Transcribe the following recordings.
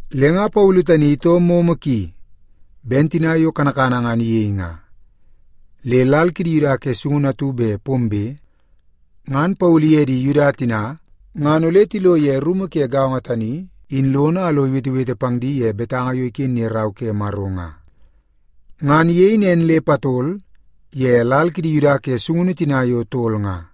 Le nga Paulu tani itoo momo ki ben tina yo kanakana ngan iyei nga. Le lal kidi Yuda ke sungunu atu bet pombe, ngan Paulu iye di Yuda tina ngan ole tilo ye rumu ke gaongo tani in lono a lo iwetewete pang di ye betanga yo iken ye Rau ke Maro nga. Ngan iyei nen le patol ye lal kidi Yuda ke sungunu tina yo tol nga.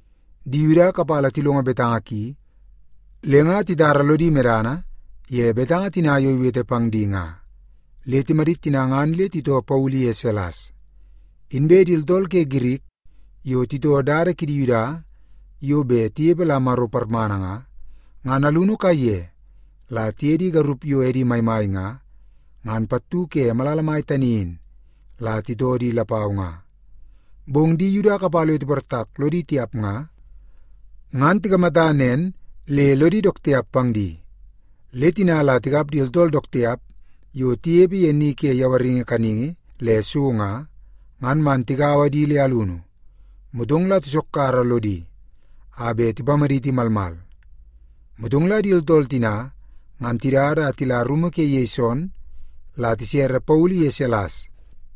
Di Yuda kapala tilongo betanga ki le nga titara lodi medana ye betanga tina yo iwete pang di nga, le timadit tina ngan le titoo Paulu iye Silas. Inbe di tooltool ke Girik yo titoo dada kidi Yuda yo bet tinepe la Maro parmana nga, ngan alunu kaiye la tiye di garup yo edi maimai nga, ngan pattu ke malala mai tani in, la titoo di lapau nga. Bong di Yuda kapala yo tiportak lodi tiap nga, ngan tikamata nen le lodi dook tiap pang di. Le tina la tikap di tooltool dook tiap yo tinepe ye ni ke yawaringi kaningi le so nga, ngan man tigaua di le alunu, motong la tisokkara lodi a bet tipamaditi malmal. Motong la di tooltool tina ngan tidada a tila rumu ke Yeson, la tisere Paulu iye Silas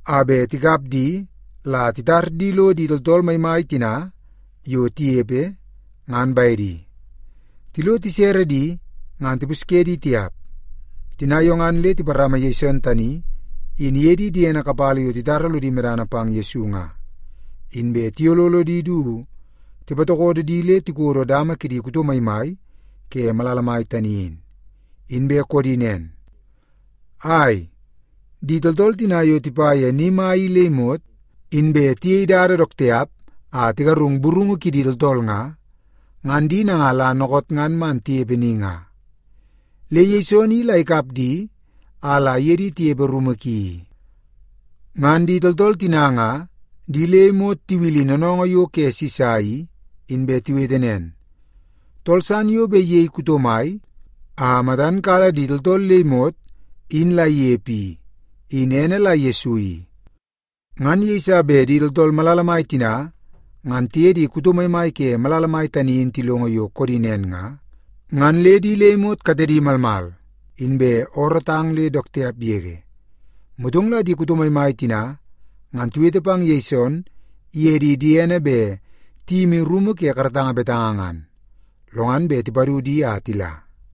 a bet tikap di la titar di lo di tooltool malala mai tina yo tinepe, ngan bedi. Tilo tisere di, ngan tipusye di tiap. Tina yo ngan le tiparama Yeson tani in iye di diedi kapala yo titara lodi medana pang Yesu nga, inbe tiyololo di du tipatokodo di lo tikodo dama kidi kuto maimai ke malala mai tani in, inbe koodi nen, “Ai, di tooltool tina yo tipa ye ni mai i le imot, inbe tiyei dada dook tiap a tigarungu burungu kidi tooltool nga, ngan di nanga la dookoot ngan man tinepe ni nga. Le Yeson i la ikap di a la iye di tinepe rumu ki i. Ngan di tooltool tina nga di le imot tiwil noonoongoo yo ke Sisa i, inbe tiwete nen, ‘Tool san yo bet iyei kuto mai a matan kala di tooltool le imot in la inepe i, in ene la Yesu i.’” Ngan yeiso bet di tooltool malala mai tina ngan tiye di kuto maimai ke malala mai tani in tilongo yo koodi nen nga, ngan le di le imot katedi malmal, inbe oorootang le dook tiap yege. Motong la di kuto maimai tina ngan tiwete pang Yeson iye di diene bet tiyimi rumu ke karatanga betanga ngan, lo ngan bet tipadu di a tila.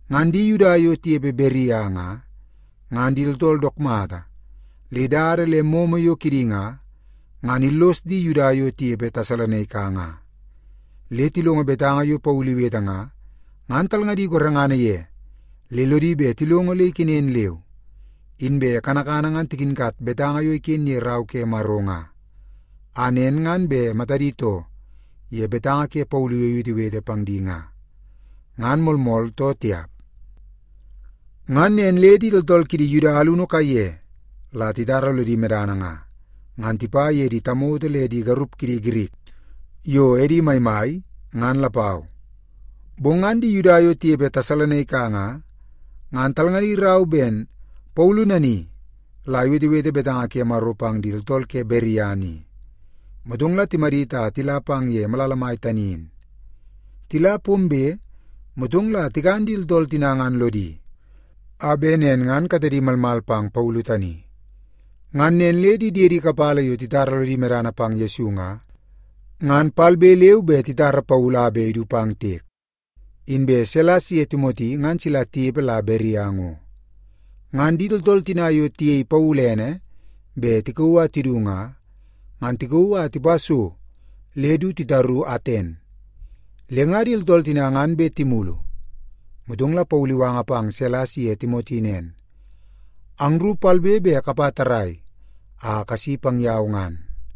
Ngan di Yuda yo tinepe Beria nga, ngan di tooltool dook mata le dada le momo yo kidi nga, ngan illos di Yuda yo tinepe Tesalonaika nga. Le tilongo betanga yo Paulu iwete nga, ngan talngadi gorengana ye le lodi bet tilongo le ikenen leu. Inbe kanakana ngan tikinkat betanga yo iken ye Rau ke Maro nga, a nen ngan bet matadi too ye betanga ke Paulu yo iwetewete pang di nga, ngan moolmool too tiap. Ngan nen le di tooltool kidi Yuda alunu kaiye la titara lodi medana nga, ngan tipa ye di tamoto le di garup kidi Girik yo edi maimai, ngan lapau. Bong ngan di Yuda yo tinepe Tesalonaika nga, ngan talngadi rau ben Paulu nani la iwetewete betanga ke Maro pang di tooltool ke Beria ni, motong la timadit a tila pang ye malala mai tani in. Tila pombe, motong la tikan di tooltool tina ngan lodi, a bet nen ngan katedi malmal pang Paulu tani. Ngan nen le di diedi kapala yo titara lodi medana pang Yesu nga, ngan palbe leu inbe titara Paulu a bet idu pang tiek. Inbe Silas iye Timoti ngan sila tinepe la Beria ngo. Ngan di tooltool tina yo tiyei Paulu ene bet tikauu a tidu nga, ngan tikauu a tipa so le du titaru Aten. Le nga di tooltool tina ngan bet timulu, motong la Paulu iwanga pang Silas iye Timoti nen, “Angru palbe leu inbe kapa tarrai a kasi pang yau ngan.”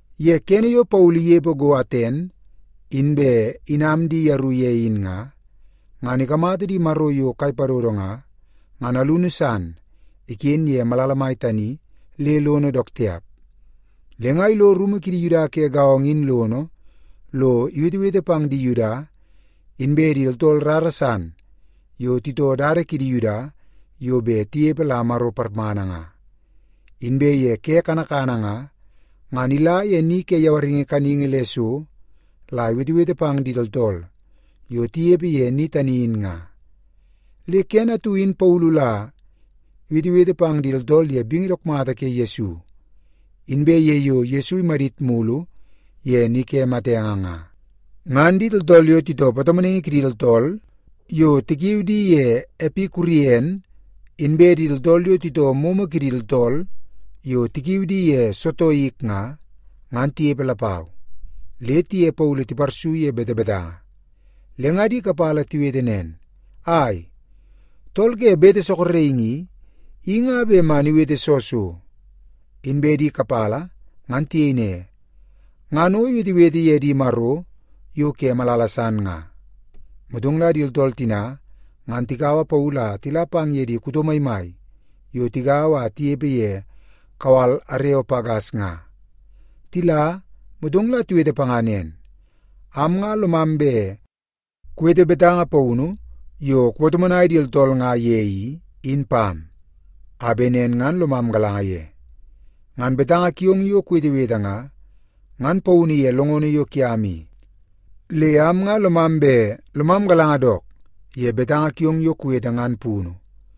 Ye kene yo Paulu inepe go Aten, inbe inam di yeru ye in nga, ngan ikamata di maro yo kai padodo nga, ngan alunu san iken ye malala mai tani le lono dook tiap. Le nga ilo rumu kidi Yuda ke gaongo in lono lo iwetewete pang di Yuda inbe di tooltool rara san yo titoo dada kidi Yuda yo bet tinepe la Maro parmana nga. Inbe ye ke kanakana nga, ngan ila ye ni ke yawaringi kaningi le so la iwetewete pang di tooltool yo tinepe ye ni tani in nga. Le kene atu in Paulu la iwetewete pang di tooltool ye bingi dook mata ke Yesu, inbe ye yo Yesu imadit mulu ye ni ke matenge nga. Ngan di tooltool yo titoo patomonaingi kidi tooltool yo tikiu di ye Epikurien, inbe di tooltool yo titoo momo kidi tooltool yo tikiu di ye Sotoik nga, ngan tinepe lapau, le tiye Paulu tiparsu ye betebetanga. Le nga di kapala tiwete nen, “Ai, tool ke bete sorokingi i, in nga bet man iwete soo so?” Inbe di kapala ngan tiyei ne, “Ngan o iwetewete ye di maro yo ke malala san nga.” Motong la di tooltool tina ngan tikaua Paulu a tila pang ye di kuto maimai yo tigaua a tinepe ye kawal Areopagas nga. Tila, motong la tiwete panga nen, “Am nga lomam bet kuwete betanga paunu yo kupatomonai di tooltool nga ye i, in pam, a bet nen ngan lomam galanga ye. Ngan betanga kiong yo kuwetewete nga, ngan paunu ye longono yo kiam i. Le am nga lomam bet lomam galanga dook ye betanga kiong yo kuwete ngan punu.”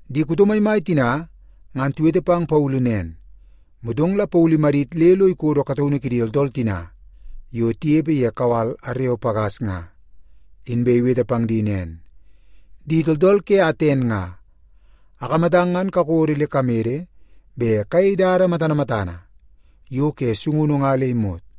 Di kuto maimai tina ngan tiwete pang Paulu nen, motong la Paulu imadit le lo ikodo kataunu kidi tooltool tina yo tinepe ye kawal Areopagas nga, inbe iwete pang di nen, “Di tooltool ke Aten nga, akamatang ngan kakodo le kamede bet kayei dada matana matana yo ke sungunu nga le imot.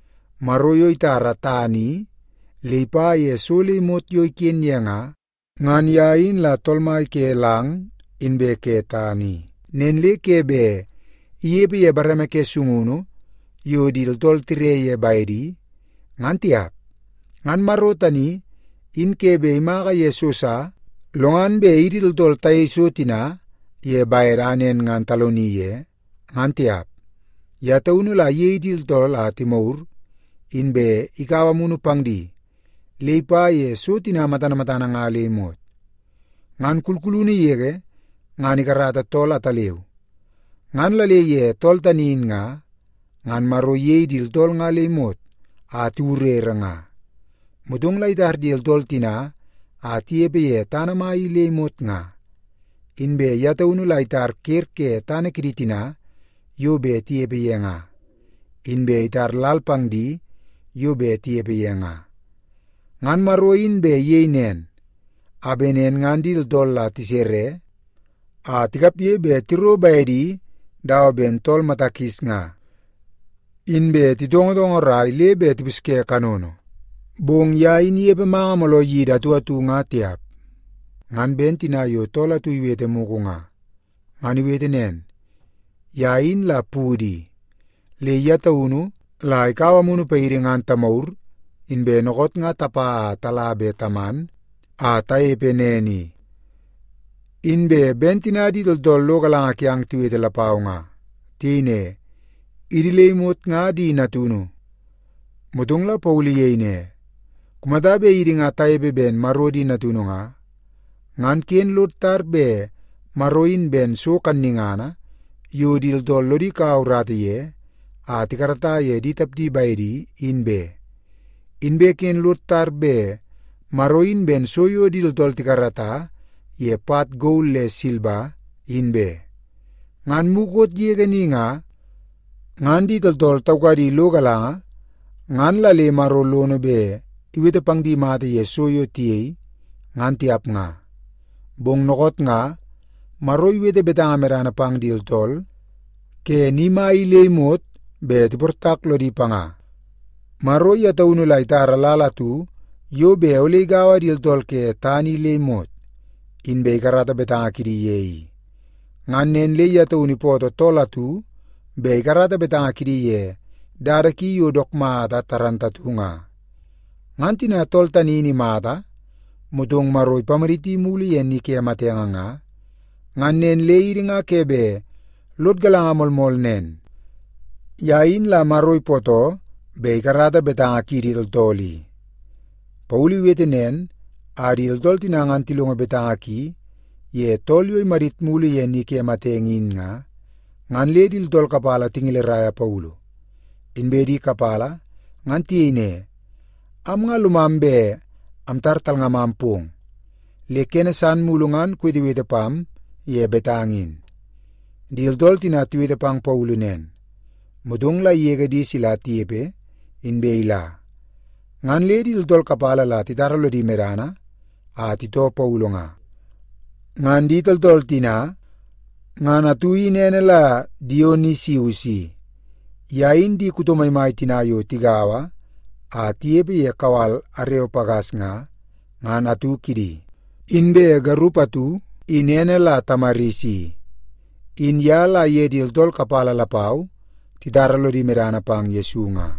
“Maro yo itara tana i le ipa ye so le imot yo iken ye nga, ngan ye in la Tool Mai ke lang inbe ke tana i. Nen le ke bet inepe ye bareme ke sungunu yo di tooltool tire ye bedi, ngan tiap. Ngan Maro tani in ke bet imaka ye so sa, lo ngan bet idi tooltool tayei so tina ye bede a nen ngan taloni ye, ngan tiap. Ye taunu la iyei di tooltool a timagur, inbe ikaua amunu pang di le ipa ye so tina matana matana nga le imot. Ngan kulkulunu yege ngan ikarata tool ataleu, ngan la le ye tool tani in nga, ngan Maro iyei di tooltool nga le imot a tiwurere nga. Motong la itar di tooltool tina a tinepe ye tana mai i le imot nga. Inbe ye taunu la itara ker ke tana kidi tina yo bet tinepe ye nga, inbe itar lal pang di yo bet tinepe ye nga. Ngan Maro in bet iyei nen, a bet nen ngan di tooltool la tisere a tikapge bet tiro bedi dawa ben tool mata kis nga, inbe titongotongorai le bet tipusye kanono. Bong ye in inepe manga mooloo yidi atu atu nga tiap. Ngan ben tina yo tool atu iwete mugu nga. Ngan iwete nen, ‘Ye in la pudu i, le ye taunu la ikaua amunu paidi ngan tamagur, inbe dookoot nga tapa a tala be taman a tanepe nen i.’ Inbe ben tina di tooltool lo galanga kiang tiwete lapau nga. Tiyei ne, ‘Idi le imot nga di natunu.’” Motong la Paulu iyei ne, “Kumata bet idi nga tanepe ben Maro di natunu nga, ngan ken lod tar bet Maro in ben so kannungana yo di tooltool lodi kaua urata ye a tikarata ye di tapdi bedi, in be. Inbe ken lod tar bet Maro in ben so yo di tooltool tikarata ye pat gol le silba, in be. Ngan mukot yege ni nga, ngan di tooltool taukadi lo galanga, ngan la le Maro lono bet iwete pang di mata ye so yo tiyei, ngan tiap nga. Bong dookoot nga, Maro iwete betanga medana pang di tooltool ke ni mai i le imot bet tiportak lodi panga. Maro ye taunu la itara lal atu yo bet ole igaua di tooltool ke tana i le imot, inbe ikarata betanga kidi ye i. Ngan nen le ye taunu ipootoo tool atu bet ikarata betanga kidi ye dada ki yo dook mata moolmool nga. Ngan tina tool tani in imata, motong Maro ipamaditi mulu ye ni ke matenge nga, ngan nen le idi nga ke bet lod galanga moolmool nen, ye in la Maro ipootoo bet ikarata betanga kiidi tooltool i.” Paulu iwete nen a di tooltool tina ngan tilongo betanga ki ye tool yo imadit mulu ye ni ke matenge in nga, ngan le di tooltool kapala tingeleraia Paulu. Inbe di kapala ngan tiyei ne, “Am nga lomam bet amtar talngamam pong, le kene san mulu ngan kuwetewete pam ye betanga in.” Di tooltool tina tiwete pang Paulu nen, motong la igege di sila tinepe, inbe ila. Ngan le di tooltool kapala la titara lodi medana a titoo Paulu nga. Ngan di tooltool tina ngan atu in ene la Dionisius i. Ye in di kuto maimai tina yo tigaua a tinepe ye kawal Areopagas nga, ngan atu kidi. Inbe garup atu in ene la Tamaris i, in ye la iye di tooltool kapala lapau titara lono medana pang Yesu nga.